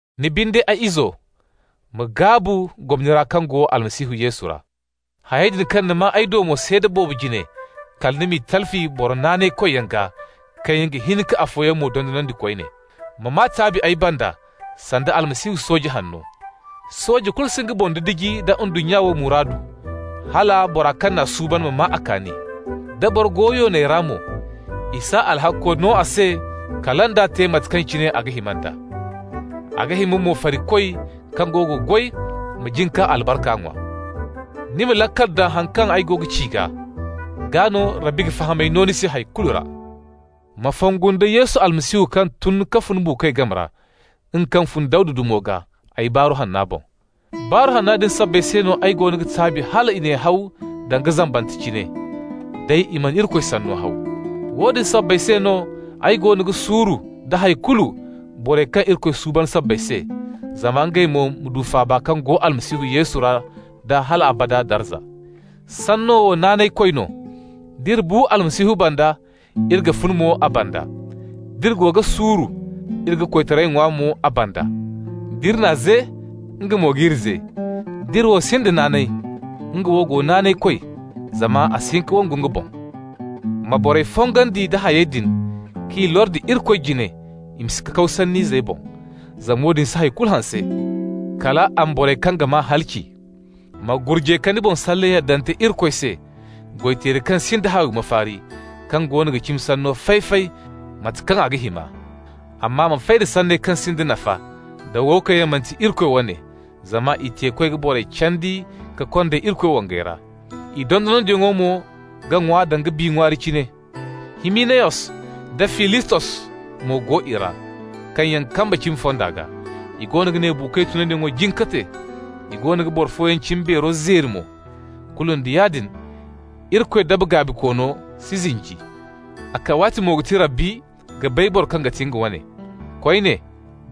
Ni binde, ay izo, ma gaabu gomni ra kaŋ go Almasihu Yesu ra. Hayey din kaŋ ni maa ay do mo seeda boobo jine, kala ni m'i talfi boro naanaykoyyaŋ gaa kaŋ yaŋ ga hin ka afooyaŋ mo dondonandi koyne. Ma maa taabi ay banda sanda Almasihu Yesu sooje hanno. Sooje kulu si nga boŋ didiji nda ndunnya wo muraadu, hala bora kaŋ n'a suuban ma maa a kaani. Da boro go yoonay ra mo, i s'a alhakko no a se kala nd'a n'a te da mate kaŋ cine a ga hima nd'a. A ga hima mo farikoy kaŋ go ga goy ma jin k'a albarka ŋwa. Ni ma laakal daŋ haŋ kaŋ ay go ga ci gaa, gaa no Rabbi ga fahamay no ni se hay kulu ra. Ma fongu nda Yesu Almasihu kaŋ tun ka fun buukoy game ra, nga kaŋ fun Dawda dumo gaa, ay Baaru Hanna boŋ. Barru Hanna din sabbay se no ay goono ga taabi hal i n'ay haw danga zambante cine. Day, i mana Irikoy sanno haw. Woodin sabbay se no ay goono ga suuru nda hay kulu borey kaŋ Irikoy suuban sabbay se, zama ngey mo ma du faaba kaŋ go Almasihu Yesu ra da hal abada darza. Sanno wo naanaykoy no: D'iri bu Almasihu banda, iri ga funa mo a banda. D'iri go ga suuru, iri ga koytaray ŋwa mo a banda. D'iri n'a ze, nga mo g'iri ze. D'iri wo sinda naanay, nga wo go naanaykoy, zama a si hin ka wangu nga boŋ. Ma borey fongandi nda hayey din k'i lordi Irikoy jine i ma si kakaw sann'izey boŋ, zama woodin si hay kulu hanse, kal a ma borey kaŋ ga maa halaci. Ma gurjay ka ni boŋ salle yaddante Irikoy se, goy-teeri kaŋ sinda haawi mafaari, kaŋ goono ga cimi sanno fay-fay mate kaŋ a ga hima. Amma ma fay da sanney kaŋ sinda nafa da wo kaŋ yaŋ manti Irikoy wane, zama i teekoy ga borey candi ka konda Irikoy wangay ra. I dondonandiyaŋo mo ga ŋwa danga bi ŋwaari cine. Himinayos da Filitos mo go i ra, kaŋ yaŋ kamba cimi fonda gaa. I goono ga ne buukoy tunyaŋo jin ka te, i goono ga boro fooyaŋ cimbeero zeeri mo. Kulu nda yaadin, Irikoy daba gaabikoono si zinji. A kawaatimo ga ti Rabbi ga bay boro kaŋ ga ti nga wane. Koyne,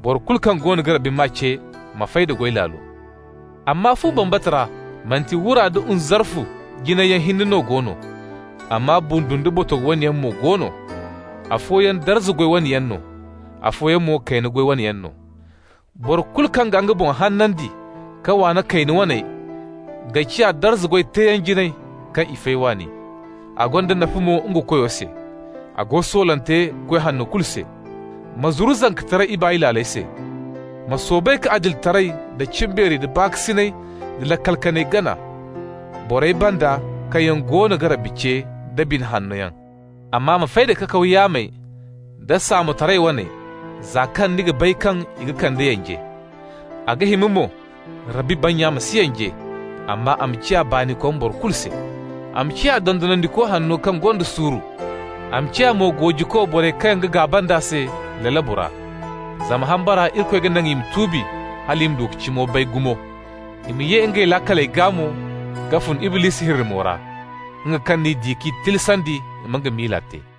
boro kulu kaŋ goono ga Rabbi maa ce ma fay da goy laalo. Amma fu bambata ra manti wura da nzarfu jinayyaŋ hinne no go no, amma bundu nda botogo wane yaŋ mo go no. Afooyaŋ darza goy wane yaŋ no, afooyaŋ mo kayna goy wane yaŋ no. Boro kulu kaŋ ga nga boŋ hanandi ka waana kayna waney ga ciya darza goy teeyaŋ jinay, kaŋ i fay waani. A gonda nafa mo nga Koyo se. A go soolante goy hanno kulu se. Ma zuru zankataray ibaay laaley se. Ma soobay ka adilitaray, da cimbeeri, da baakasinay da laakal kanay gana, borey banda kaŋ yaŋ goono ga Rabbi ce da bine hanno yaŋ. Amma ma fay da kakaw yaamey da saamotaray waney, za kaŋ ni ga bay kaŋ i ga kande yanje. A ga hima mo Rabbi bannya ma si yanje, amma a ma ciya baanikom boro kulu se. A ma ciya dondonandiko hanno kaŋ gonda suuru. A ma ciya mo goojiko borey kaŋ ga gaaba nd'a se lalabu ra, zama hambara Irikoy ga naŋ i ma tuubi hal i ma du ka cimo bay gumo. I ma ye ngey laakaley gaa mo ka fun Iblisi hirrimo ra, nga kaŋ n'i di k'i tilasandi i ma nga miila te.